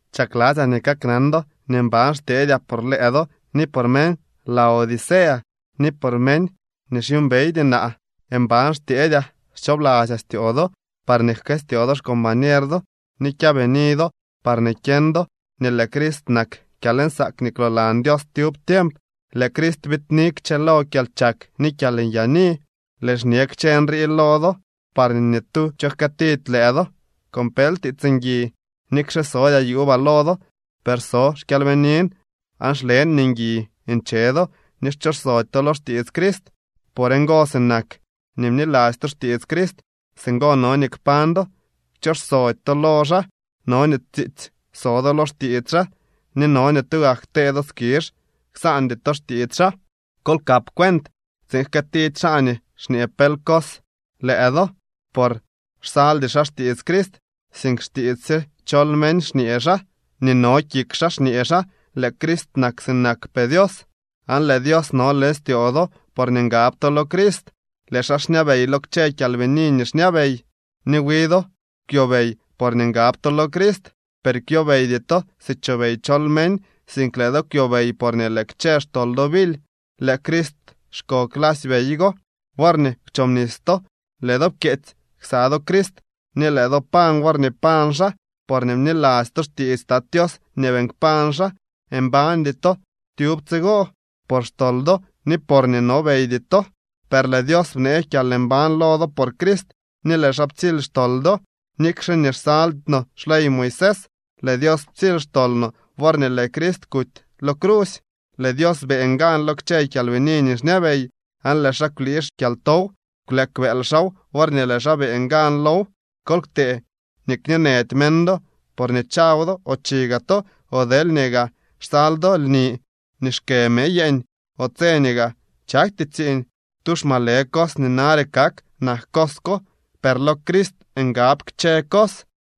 Chakladzyaa nii kaknan do nii mban xtyeedyaa por lëë do ni por meñ Laodicea ni por meñ nii xyuumbeydy naa. Mban xtyeedyaa xchoobladzyaa styoo do parñee jkëstyoo do xcombañer do ni kyaabini do parñee kyeñ do nii lëë Crist nak kyalnsaak nii kwloolan Dios tyub tiemp. Lëë Crist biidni kchëlo kyalchak ni kyalnyaani. Lëën xñe kchë nrii lo do parñee ni tu cho jkëëtidy lëë do con pel tiits ngui. Nikxe sodyaa yuubaa lo do, per so xkyalbiniin aan xlen nii ngui nche do ni xchooxsody to lo xtiits Crist. Por ngo, sinak nii bniladzy to xtiits Crist, singo no nii kpañ do, kchooxsody to lo xaa. No nii tsiitsy so do lo xtiits xaa, ni no nii tugak ktee do skizh, ksaandy to xtiits xaa. Kol kap cuent tsiin jkëëtidy xaa nii xñee pel cos lëë do por xsaldy xaa xtiits Crist, sink xtiits sye chol meñ xñee xaa, ni nii no kik xaa xñee xaa. Lëë Crist nak sinakpee Dios, aan lëë Dios no leñ styoo do porñee ngab to lo Crist. Lëë xaa xñabey lo kchë kyalbini nii xñabey. Wi do kwyobey porñee ngab to lo Crist, per kwyobeydy to si chobey chol meñ, sink lëë do kwyobey porñee lëë kchë xtol do bily. Lëë Crist xko clasy bey go. Worñee kwchobnis to lëë do pkyeetsy ksa do Crist ni lëë do pañ worñee pañ xaa, porñee bniladzy to xtiits Tat Tios nii beeñ kpañ xaa. Mbañdy to tyub tsigo por xtol do ni porñee nobeydy to, per lëë Dios bnee kyalmbañ lo do por Crist ni lëë xaa ptsily xtol do. Nikxe nii xsaldy no xley Moisés, lëë Dios ptsily xtol no worñee lëë Crist kuty lo crusy. Lëë Dios beeñ gan lo kchë kyalbini nii xñabey, aan lëë xaa kwlii xkyaltow. Kwleek bëël xaaw worñee lëë xaa beeñ gan low. Kol ktee nii kñeenëdy meñ do por nii chaw do o chi gaa to, o deelñee gaa xsal do lni nii xkë mëë yeeñ o tse nii gaa chakty tsiiñ. Tu xmalë cos nii nare kak nak cos ko, per lo Crist ngab kchë cos.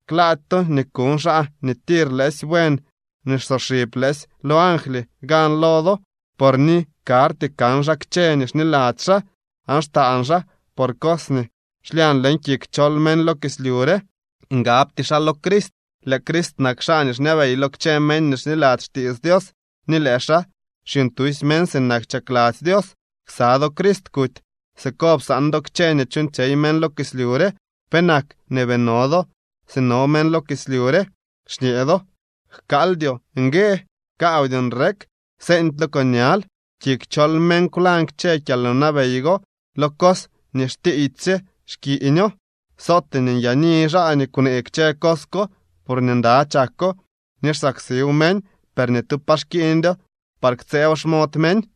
Klaady to nii kuñ xaa nii tir lëësy buen ni xsoxib lëësy lo angly gan lo do. Por ni karty kan xaa kchë nii xniladzy xaa, aan xtaan xaa por cos nii xlyañ leñ kik chol meñ lo kislyu re. Ngabty xaa lo Crist. Lëë Crist nak xaa nii xñabey lo kchë meñ nii xniladzy xtiits Dios, ni lëë xaa xyuuñtusy meñ sinak chakladzy Dios. Ksa do Crist kuty. Siko psaan do kchë nii chuuñtsyey meñ lo kislyu re. ¿Penak nii bii no do si no meñ lo kislyu re? Xñee do: “Jkaaldyoo ngue, kaawdyoo nrek, seeñdylo con ñal.” Kik chol meñ kwlañ kchë kyalwnabey go. Lo cos nii xtiiydysye xkiiñoo. Sootee nii nyaani xaa nii kwnee kchë cos ko, porñee nda chako ni xsaksiw meñ, per ni tu pa xkiiñdyo par ktsëëw xmod meñ.